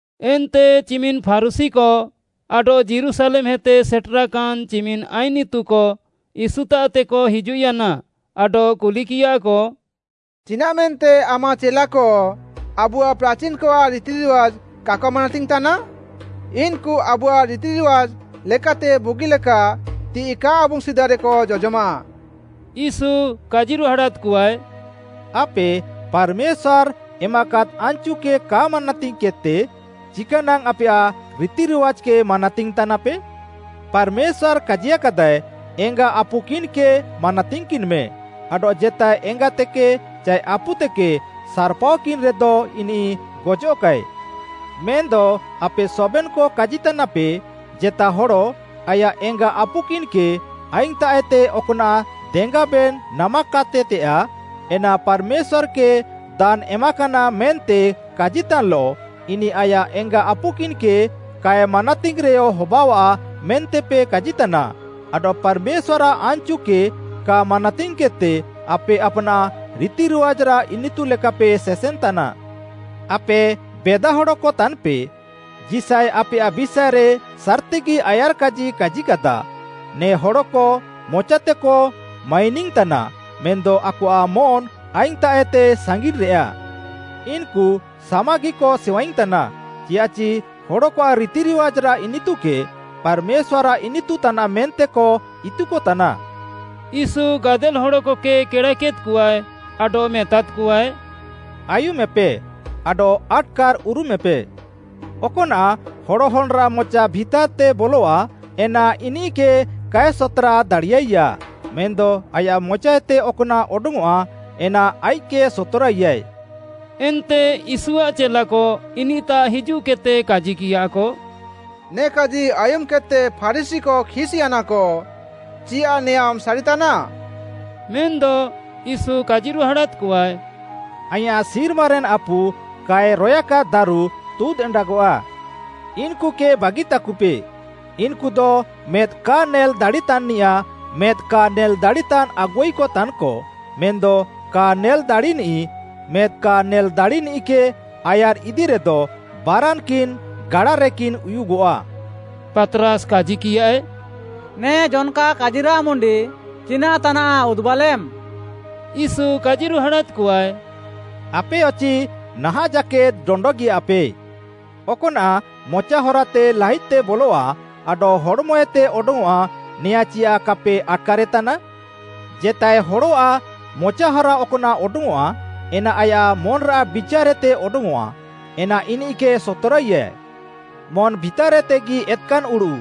ଏନ୍ତେ ଚିମିନ୍‌ ଫାରୁଶୀକ ଆଡଃ ଯୀରୁଶାଲେମ୍‌ହେତେ ସେଟେରାକାନ୍‍ ଚିମିନ୍‌ ଆଇନ୍‌ ଇତୁକ ୟୀଶୁତାଃତେକ ହିଜୁଃୟାନା ଆଡଃ କୁଲିକିୟାକ, “ଚିନାଃମେନ୍ତେ ଆମାଃ ଚେଲାକ ଆବୁଆଃ ପ୍ରାଚିନ୍‌କଆଃ ରିତିରିୱାଜ୍‌କ କାକ ମାନାତିଙ୍ଗ୍‌ତାନା? ଇନ୍‌କୁ ଆବୁଆଃ ରିତିରିୱାଜ୍‌ ଲେକାତେ ବୁଗିଲେକା ତିଃଇ କା ଆବୁଙ୍ଗ୍‌ ସିଦାରେକ ଜଜମାଃ!” ୟୀଶୁ କାଜିରୁହାଡ଼ାଦ୍‌କଆଏ, “ଆପେ ପାର୍‌ମେଶ୍ୱାର୍‌ ଏମାକାଦ୍‌ ଆନ୍‌ଚୁକେ କା ମାନାତିଙ୍ଗ୍‌କେଦ୍‌ତେ ଚିକାନାଙ୍ଗ୍‌ ଆପେୟାଃ ରିତିରିୱାଜ୍‌କେ ମାନାତିଙ୍ଗ୍‌ ତାନାପେ? ପାର୍‌ମେଶ୍ୱାର୍‌ କାଜିୟାକାଦାଏ, ‘ଏଙ୍ଗାମ୍ ଆପୁମ୍‌କିନ୍‌କେ ମାନାତିଙ୍ଗ୍‌କିନ୍‌ମେ,’ ଆଡଃ ‘ଜେତାଏ ଏଙ୍ଗାତେକେ ଚାଏ ଆପୁତେକେ ସାର୍‌ପାଅକିନ୍‌ରେଦ ଇନିଃ ଗଜଃକାଏ।’ ମେନ୍‌ଦ ଆପେ ସବେନ୍‌କ କାଜିତାନାପେ, ଜେତା ହଡ଼ ଆୟାଃ ଏଙ୍ଗା ଆପୁକିନ୍‌କେ, ଆଇଙ୍ଗ୍‌ତାଃଏତେ ଅକ୍‌ନାଃ ଦେଙ୍ଗାବେନ୍‌ ନାମାକାତେତେୟାଃ, ଏନା ‘ପାର୍‌ମେଶ୍ୱାର୍‌କେ ଦାନ୍‌ ଏମାକାନା’ ମେନ୍ତେ କାଜିତାନ୍‌ଲଃ, ଇନିଃ ଆୟାଃ ଏଙ୍ଗା ଆପୁକିନ୍‌କେ କାଏ ମାନାତିଙ୍ଗ୍‌ରେୟ ହବାଅଃଆ, ମେନ୍ତେପେ କାଜିତାନା। ଆଡଃ ପାର୍‌ମେଶ୍ୱାର୍‌ଆଃ ଆନ୍‌ଚୁକେ କା ମାନାତିଙ୍ଗ୍‌କେଦ୍‌ତେ ଆପେ ଆପ୍‌ନାଃ ରିତିରିୱାଜ୍‌ରାଃ ଇନିତୁ ଲେକାପେ ସେସେନ୍‌ତାନା। ଆପେ ବେଦାହଡ଼କ ତାନ୍‌ପେ, ଯିଶାୟ ଆପେୟାଃ ବିଷାଏରେ ସାର୍‌ତିଗି ଆୟାର୍‌କାଜି କାଜିକାଦା, “‘ନେ ହଡ଼କ ମଚାତେକ ମାଇନିଙ୍ଗ୍‌ତାନା, ମେନ୍‌ଦ ଆକଆଃ ମନ୍‌ ଆଇଙ୍ଗ୍‌ତାଃଏତେ ସାଙ୍ଗିନ୍‌ରେଆ। ଇନ୍‌କୁ ସାମାଗିକ ସେୱାଇଙ୍ଗ୍‌ତାନା, ଚିୟାଃଚି ହଡ଼କଆଃ ରିତିରିୱାଜ୍‌ରାଃ ଇନିତୁକେ ପାର୍‌ମେଶ୍ୱାର୍‌ଆଃ ଇନିତୁ ତାନାଃ ମେନ୍ତେକ ଇତୁକତାନା!’” ୟୀଶୁ ଗାଦେଲ୍‌ ହଡ଼କକେ କେଡ଼ାକେଦ୍‌କଆଏ ଆଡଃ ମେତାଦ୍‌କଆଏ, “ଆୟୁମେପେ ଆଡଃ ଆଟ୍‌କାର୍‌ ଉରୁମେପେ। ଅକ୍‌ନାଃ ହଡ଼ ହନ୍‌ରାଃ ମଚା ଭିତାର୍‌ତେ ବଲଃଆ ଏନା ଇନିଃକେ କାଏ ସତ୍‌ରା ଦାଡ଼ିୟାଇଆ, ମେନ୍‌ଦ ଆୟାଃ ମଚାଏତେ ଅକ୍‌ନାଃ ଅଡଙ୍ଗ୍‌ଅଃଆ ଏନା ଆଇଃକ୍‌କେ ସତ୍‌ରାଇଆଏ।” ଏନ୍ତେ ୟୀଶୁଆଃ ଚେଲାକ ଇନିଃତାଃ ହିଜୁଃକେଦ୍‌ତେ କାଜିକିୟାକ, “ନେ କାଜି ଆୟୁମ୍‌କେଦ୍‌ତେ ଫାରୁଶୀକ ଖିସ୍‌ୟାନାକ, ଚିୟାଃ ନେଆଁଁମ୍‌ ସାରିତାନା?” ମେନ୍‌ଦ ୟୀଶୁ କାଜିରୁହାଡ଼ାଦ୍‌କଆଏ, “ଆଇଁୟାଃ ସିର୍ମାରେନ୍‌ ଆପୁ କାଏ ରୟାକାଦ୍‌ ଦାରୁ ତୁଦ୍ ଏଣ୍ଡାଗଆଃ। ଇନ୍‌କୁକେ ବାଗିତାକୁପେ, ଇନ୍‌କୁଦ ମେଦ୍‌ କା ନେଲ୍‌ ଦାଡ଼ିତାନ୍‌ନିୟାଃ ମେଦ୍‌ କା ନେଲ୍‌ ଦାଡ଼ିତାନ୍‌ ଆଗୁଆଇକ ତାନ୍‌କ, ମେଦ୍‌ କା ନେଲ୍‌ ଦାଡ଼ିନିଃ, ମେଦ୍‌ କା ନେଲ୍‌ଦାଡ଼ିନିଃକେ ଆୟାର୍‌ଇଦିରେଦ ବାରାନ୍‌କିନ୍‌ ଗାଡାରେକିନ୍ ଉୟୁଗଃଆ।” ପାତ୍‌ରାସ୍‌ କାଜିକିୟାଏ, “ନେ ଜନ୍‌କା କାଜିରାଃ ମୁଣ୍ଡି ଚିନାଃ ତାନାଃ ଉଦୁବାଲେମ୍‌?” ୟୀଶୁ କାଜିରୁହାଡ଼ାଦ୍‌କଆଏ, “ଆପେୟଚି ନାହାଁଃ ଜାକେଦ୍‌ ଡଣ୍ଡଗିୟାପେ। ଅକ୍‌ନାଃ ମଚା ହରାତେ ଲାହିଦ୍‌ତେ ବଲଃଆ ଆଡଃ ହଡ଼୍‌ମଏତେ ଅଡଙ୍ଗ୍‌ଅଃଆ ନେୟାଁ ଚିୟାଃ କାପେ ଆଟ୍‌କାରେତାନା? ଜେତାଏ ହଡ଼ଆଃ ମଚାହରା ଅକ୍‌ନାଃ ଅଡଙ୍ଗ୍‌ଅଃଆ ଏନା ଆୟାଃ ମନ୍‌ରାଃ ବିଚାର୍‌ଏତେ ଅଡଙ୍ଗ୍‌ଅଃଆ, ଏନା ଇନିଃକେ ସତ୍‌ରାଇଆ। ମନ୍‌ ଭିତାର୍‌ଏତେଗି ଏତ୍‌କାନ୍‌ ଉଡ଼ୁଃ,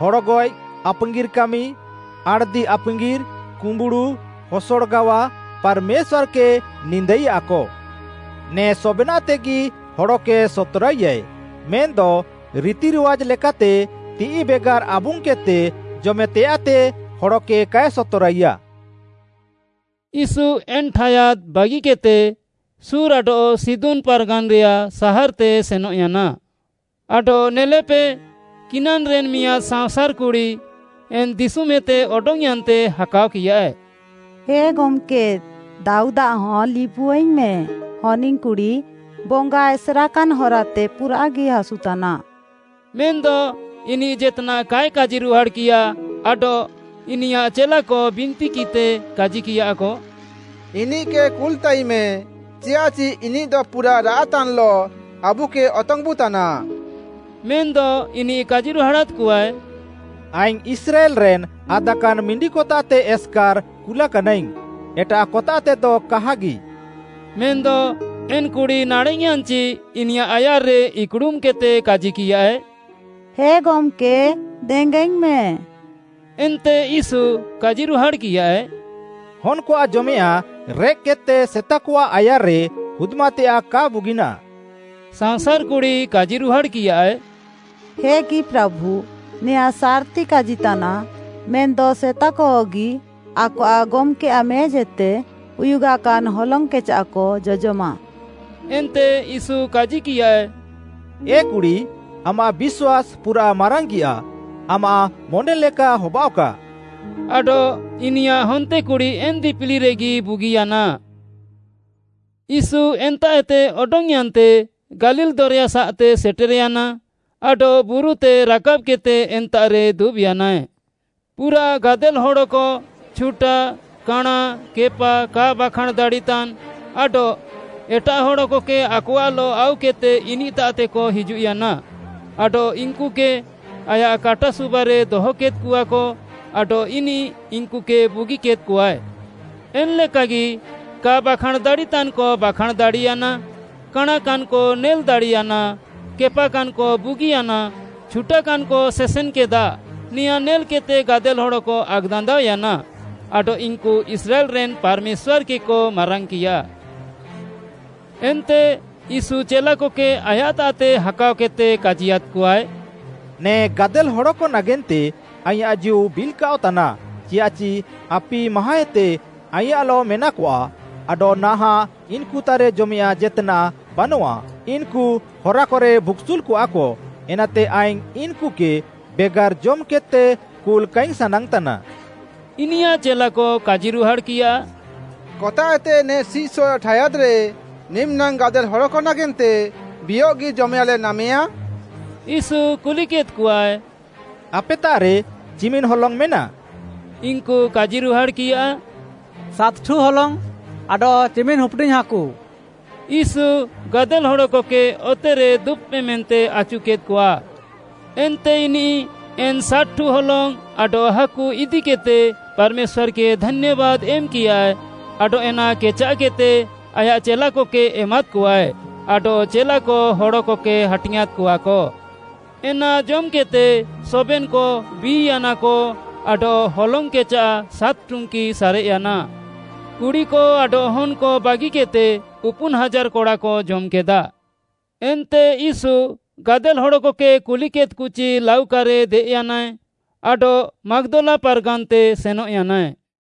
ହଡ଼ଗଏଃ, ଆପାଙ୍ଗିର୍‌ କାମି, ଆଣ୍‌ଦି ଆପାଙ୍ଗିର୍‌, କୁମ୍ବୁଡ଼ୁ, ହସଡ଼ ଗାୱା, ପାର୍‌ମେଶ୍ୱାର୍‌କେ ନିନ୍ଦାଇଆକ। ନେ ସବେନାଃତେଗି ହଡ଼କେ ସତ୍‌ରାଇଆଏ, ମେନ୍‌ଦ ରିତିରିୱାଜ୍‌ ଲେକାତେ ତିଃଇ ବେଗାର୍‌ ଆବୁଙ୍ଗ୍‌କେଦ୍‌ତେ ଜମେତେୟାଃତେ ହଡ଼କେ କାଏ ସତ୍‌ରାଇଆ।” ୟୀଶୁ ଏନ୍‌ ଠାୟାଦ୍‌ ବାଗିକେଦ୍‌ତେ ସୋର୍‌ ଆଡଃ ସିଦୋନ୍‌ ପାର୍‌ଗାନ୍‌ରେୟାଃ ସାହାର୍‌ତେ ସେନଃୟାନା। ଆଡଃ ନେଲେପେ କିନାନ୍‌ରେନ୍ ମିଆଁଦ୍‌ ସାଅଁସାର୍‌ କୁଡ଼ି ଏନ୍‌ ଦିଶୁମ୍ଏତେ ଅଡଙ୍ଗ୍‌ୟାନ୍‌ତେ ହାକାଅକିୟାଏ, “ହେ ଗମ୍‌କେ, ଦାଉଦ୍‌ଆଃ ହନ୍‌ ଲିବୁଆଇଙ୍ଗ୍‌ମେ, ହନିଙ୍ଗ୍‌କୁଡ଼ି, ବଙ୍ଗା ଏସେର୍‌କାନ୍‌ ହରାତେ ପୁରାଃଗି ହାସୁତାନା।” ମେନ୍‌ଦ ଇନିଃ ଜେତ୍‌ନାଃ କାଏ କାଜିରୁହାଡ଼୍‌କିୟା ଆଡଃ ଇନିୟାଃ ଚେଲାକ ବିନ୍ତିକିଃତେ କାଜିକିୟାକ, “ଇନିଃକେ କୁଲ୍‌ତାଇମେ, ଚିୟାଃଚି ଇନିଃଦ ପୁରାଃ ରାଆଃତାନ୍‌ଲଃ ଆବୁକେ ଅତଙ୍ଗ୍‌ବୁତାନା।” ମେନ୍‌ଦ ଇନିଃ କାଜିରୁହାଡ଼ାଦ୍‌କଆଏ, “ଆଇଙ୍ଗ୍‌ ଇସ୍ରାଏଲ୍‌ରେନ୍‌ ଆଦାକାନ୍‌ ମିଣ୍ଡିକତାଃତେ ଏସ୍‌କାର୍‌ କୁଲାକାନାଇଙ୍ଗ୍‌, ଏଟାଃକତାଃତେଦ କାହାଗି।” ମେନ୍‌ଦ ଏନ୍‌କୁଡ଼ି ନାଡ଼େଃୟାନ୍‌ଚି ଇନିୟାଃ ଆୟାର୍‌ରେ ଇକ୍‌ଡ଼ୁମ୍‌କେଦ୍‌ତେ କାଜିକିୟାଏ, “ହେ ଗମ୍‌କେ, ଦେଙ୍ଗାଇଙ୍ଗ୍‌ମେ।” ଏନ୍ତେ ୟୀଶୁ କାଜିରୁହାଡ଼୍‌କିୟାଏ, “ହନ୍‌କଆଃ ଜମେୟାଃଁ ରେଃକ୍‌କେଦ୍‌ତେ ସେତାକଆଃ ଆୟାର୍‌ରେ ହୁଦ୍‌ମାତେୟାଃ କା ବୁଗିନାଃ।” ସାଅଁସାର୍‌ କୁଡ଼ି କାଜିରୁହାଡ଼୍‌କିୟାଏ, “ହେଗି ପ୍ରାଭୁ, ନେଆଁଁ ସାର୍‌ତି କାଜିତାନାଃ, ମେନ୍‌ଦ ସେତାକହଗି ଆକଆଃ ଗମ୍‌କେଆଃ ମେଜ୍‌ଏତେ ଉୟୁଗାକାନ୍ ହଲଙ୍ଗ୍‌କେଚାଃକ ଜଜମାଃ।” ଏନ୍ତେ ୟୀଶୁ କାଜିକିୟାଏ, “ଏ କୁଡ଼ି, ଆମାଃ ବିଶ୍ୱାସ୍‌ ପୁରାଃ ମାରାଙ୍ଗିଆଃ! ଆମାଃ ମନେଲେକା ହବାଅଃକା।” ଆଡଃ ଇନିୟାଃ ହନ୍ତେକୁଡ଼ି ଏନ୍‌ ଦିପିଲିରେଗି ବୁଗିୟାନା। ୟୀଶୁ ଏନ୍ତାଃଏତେ ଅଡଙ୍ଗ୍‌ୟାନ୍‌ତେ ଗାଲିଲ୍‌ ଦରେୟାସାଃତେ ସେଟେର୍‌ୟାନା, ଆଡଃ ବୁରୁତେ ରାକାବ୍‌କେଦ୍‌ତେ ଏନ୍ତାଃରେ ଦୁବ୍‌ୟାନାଏ। ପୁରାଃ ଗାଦେଲ୍‌ ହଡ଼କ ଛୁଟା, କାଣାଁ, କେପା, କା ବାଖାଁଣ୍‌ ଦାଡ଼ିତାନ୍‌, ଆଡଃ ଏଟାଃ ହଡ଼କକେ ଆକଆଃଲଃ ଆଉକେଦ୍‌ତେ ଇନିଃତାଃତେକ ହିଜୁଃୟାନା ଆଡଃ ଇନ୍‌କୁକେ ଆୟାଃ କାଟା ସୁବାରେ ଦହକେଦ୍‌କଆକ ଆଡଃ ଇନିଃ ଇନ୍‌କୁକେ ବୁଗିକେଦ୍‌କଆଏ। ଏନ୍‌ଲେକାଗି କା ବାଖାଁଣ୍‌ ଦାଡ଼ିତାନ୍‌କ ବାଖାଁଣ୍‌ ଦାଡ଼ିୟାନା, କାଣାଁକାନ୍‌କ ନେଲ୍‌ ଦାଡ଼ିୟାନା, କେପାକାନ୍‌କ ବୁଗିୟାନା, ଛୁଟାକାନ୍‌କ ସେସେନ୍‌କେଦା, ନେଆଁଁ ନେଲ୍‌କେଦ୍‌ତେ ଗାଦେଲ୍‌ ହଡ଼କ ଆକ୍‌ଦାନ୍ଦାଅୟାନା ଆଡଃ ଇନ୍‌କୁ ଇସ୍ରାଏଲ୍‌ରେନ୍‌ ପାର୍‌ମେଶ୍ୱାର୍‌କେକ ମାରାଙ୍ଗ୍‌କିୟା। ଏନ୍ତେ ୟୀଶୁ ଚେଲାକକେ ଆୟାଃତାଃତେ ହାକାଅକେଦ୍‌ତେ କାଜିୟାଦ୍‌କଆଏ, “ନେ ଗାଦେଲ୍‌ ହଡ଼କ ନାଗେନ୍ତେ ଆଇଁୟାଃ ଜୀଉ ବିଲ୍‌କାଅଃତାନା, ଚିୟାଃଚି ଆପି ମାହାଁଏତେ ଆଇଁୟାଃଲଃ ମେନାକଆ, ଆଡଃ ନାହାଁଃ ଇନ୍‌କୁତାଃରେ ଜମେୟାଃଁ ଜେତ୍‌ନାଃ ବାନଃଆ, ଇନ୍‌କୁ ହରାକରେ ଭୁକ୍‌ସୁଲ୍‌କଆଃକ, ଏନାତେ ଆଇଙ୍ଗ୍‌ ଇନ୍‌କୁକେ ବେଗାର୍‌ ଜମ୍‌କେଦ୍‌ତେ କୁଲ୍‌ କାଇଙ୍ଗ୍‌ ସାନାଙ୍ଗ୍‌ତାନା।” ଇନିୟାଃ ଚେଲାକ କାଜିରୁହାଡ଼୍‌କିୟା, “କତାଃଏତେ ନେ ସିଃସଏଃ ଠାୟାଦ୍‌ରେ ନିମିନାଙ୍ଗ୍‌ ଗାଦେଲ୍‌ ହଡ଼କ ନାଗେନ୍ତେ ବିୟଃଗି ଜମେୟାଃଁଲେ ନାମେୟା?” ୟୀଶୁ କୁଲିକେଦ୍‌କଆଏ, “ଆପେତାଃରେ ଚିମିନାଙ୍ଗ୍‌ ହଲଙ୍ଗ୍‌ ମେନା?” ଇନ୍‌କୁ କାଜିରୁହାଡ଼୍‌କିୟା, “ସାତ୍‌ଠୁ ହଲଙ୍ଗ୍‌ ଆଡଃ ଚିମିନ୍‌ ହୁପ୍‌ଡିଙ୍ଗ୍‌ ହାକୁ।” ୟୀଶୁ, ଗାଦେଲ୍‌ ହଡ଼କକେ ଅତେରେ ଦୁବ୍‌ପେ ମେନ୍ତେ ଆଚୁକେଦ୍‌କଆ। ଏନ୍ତେ ଇନିଃ ଏନ୍‌ ସାତ୍‌ଠୁ ହଲଙ୍ଗ୍‌ ଆଡଃ ହାକୁ ଇଦିକେଦ୍‌ତେ ପାର୍‌ମେଶ୍ୱାର୍‌କେ ଧାନ୍ୟାବାଦ୍‌ ଏମ୍‌କିୟାଏ ଆଡଃ ଏନା କେଚାଃକେଦ୍‌ତେ ଆୟାଃ ଚେଲାକକେ ଏମାଦ୍‌କଆଏ ଆଡଃ ଚେଲାକ ହଡ଼କକେ ହାଟିଙ୍ଗ୍‌ଆଁଁଦ୍‌କଆକ। ଏନା ଜମ୍‌କେଦ୍‌ତେ ସବେନ୍‌କ ବି'ୟାନାକ ଆଡଃ ହଲଙ୍ଗ୍‌ କେଚାଃ ସାତ୍‌ ଟୁଙ୍କି ସାରେଃୟାନା। କୁଡ଼ିକ ଆଡଃ ହନ୍‌କ ବାଗିକେଦ୍‌ତେ ଉପୁନ୍‌ ହାଜାର୍‌ କଡ଼ାକ ଜମ୍‌କେଦା। ଏନ୍ତେ ୟୀଶୁ ଗାଦେଲ୍‌ ହଡ଼କକେ କୁଲ୍‌କେଦ୍‌କଚି ଲାଉକାରେ ଦେଏଃୟାନାଏ ଆଡଃ ମାଗ୍‌ଦଲା ପାର୍‌ଗାନ୍‌ତେ ସେନଃୟାନାଏ।